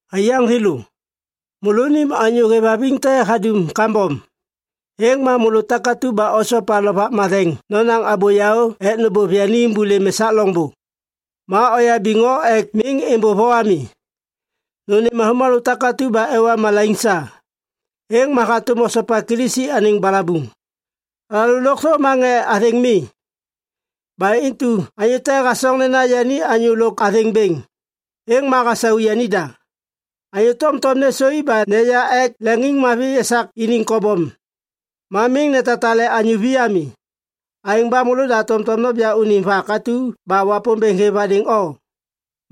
Aiyaŋ thêlô, môlônim anyô hêvhaviŋ te hadum kambom, êŋ ma môlô takatu ba osopa Lovak Matheŋ nonaŋ abô yaô ek nôbôv yani êmbôlêm esak loŋbô. Ma oyabiŋ o ek miŋ êmbôv o ami. Nônêm avômalô takatu ba ewa malaiŋ sa. Êŋ ma hatôm hosopa Kilisi anêŋ balabuŋ. Alalô lôkthô ma ŋê athêŋ mi. Ba intu anyô te hasoŋ nena yani anyô lôk athêŋ bêŋ, êŋ ma hasau yanida. Anyô tomtom nêsôi ba neya ek leŋiŋmavi esak iniŋ kobom ma miŋ netatale anyô vi ami. Aêŋ ba môlôda tomtom noja unim vak atu ba Wapômbêŋ hêv hadêŋ o.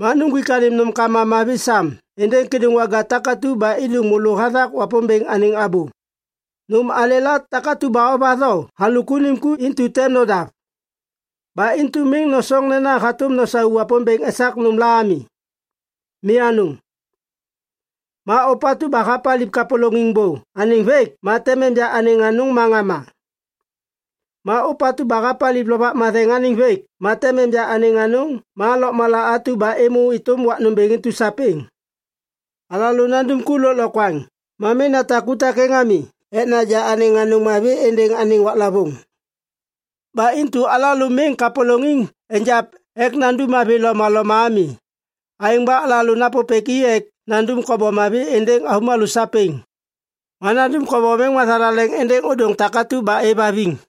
Ma nuŋgwik anêm nômkama mavi sam êndêŋ kêdôŋwaga takatu ba êdôŋ môlô hathak Wapômbêŋ anêŋ abô. Nôm alêla takatu ba ovatho halôk unim ku intu tem nodav. Ba intu miŋ nosoŋ nena hatôm nosau Wapômbêŋ esak nômla ami. Mi anôŋ. Ma ôpatu ba hapaliv kapôlôŋiŋ bô anêŋ vêk ma tem enja anêŋ anôŋ ma ŋama. Ma ôpatu ba hapaliv Lovak Matheŋ anêŋ vêk ma tem enja anêŋ anôŋ ma lôkmala atu ba êmô êtôm wak nômbêŋ intu sapêŋ. Alalô nandum ku lôklokwaŋ ma miŋ natak ku takêŋ ami ek naja anêŋ anôŋ mavi êndêŋ anêŋ waklavôŋ. Ba intu alalô miŋ kapôlôŋiŋ egiap ek nandum mavi lomaloma ami. Aêŋ ba alalô napôpêk i ek nandum kobom mavi êndêŋ avômalô sapêŋ. Ma nandum kobom êŋ mathalaleŋ êndêŋ ôdôŋ takatu ba êvhaviŋ.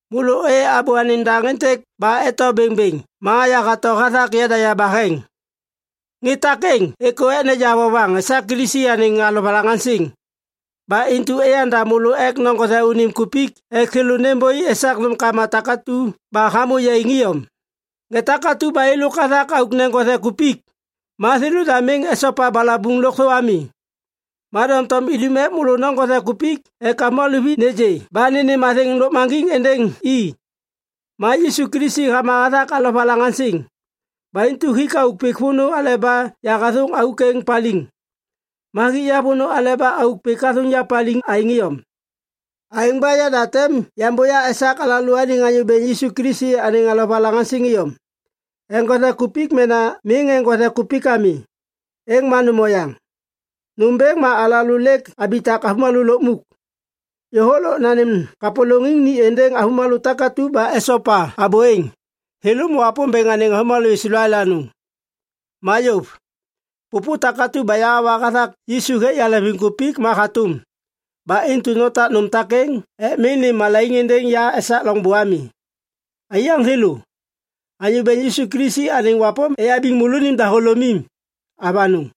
Môlô ôyê abô anêŋ daŋ êntêk ba eto bêŋbêŋ ma yahato hathak yada yabaheŋ. Ŋê takêŋ êkô ek neja vovaŋ esak Kilisi anêŋ alovalaŋaŋsiŋ. Ba intu eyanda môlô ek noŋgothe unim kupik ek thêlô nêmbôi esak nômkama takatu ba hamô yaiŋ iyom. Ŋê takatu ba êlôk hathak auk neŋgothe kupik, ma thêlôda miŋ esopa balabuŋ lôkthô ami. Ma doŋtom idum ek môlô noŋgothe kupik ek avômalô vi nêgê ba nênêm athêŋ lôkmaŋgiŋ êndêŋ i. Ma Yisu Kilisi hama hathak alovalaŋaŋsiŋ. Ba intu hik auk pik vônô aleba yahathôŋ auk êŋ paliŋ. Ma hik ya vônô aleba auk pik hathôŋ ya paliŋ aêŋ iyom. Aêŋ ba yada tem yambôya esak alalôaniŋ Anyô Bêŋ Yisu Kilisi anêŋ alovalaŋaŋsiŋ iyom. Eŋgothe kupik mena miŋ eŋgothe kupik ami, êŋ ma nôm oyaŋ. Nômbêŋ ma alalô lêk abitak avômalô lukmuk. Yôhôk lôk nanêm kapôlôŋiŋ ni êndêŋ avômalô takatu ba esopa abô êŋ, thêlô ma Wapômbêŋ anêŋ avômalô Islael anôŋ. Ma yôv. Pôpô takatu ba yahawa hathak Yisu hêk yaleŋviŋkupik ma hatôm. Ba intu notak nôm takêŋ ek miŋ nêm malaiŋ êndêŋ ya esak loŋbô ami. Aiyaŋ thêlô, Anyô Bêŋ Yisu Kilisi anêŋ wapôm eyabiŋ môlônim dahôlômim. Avanôŋ.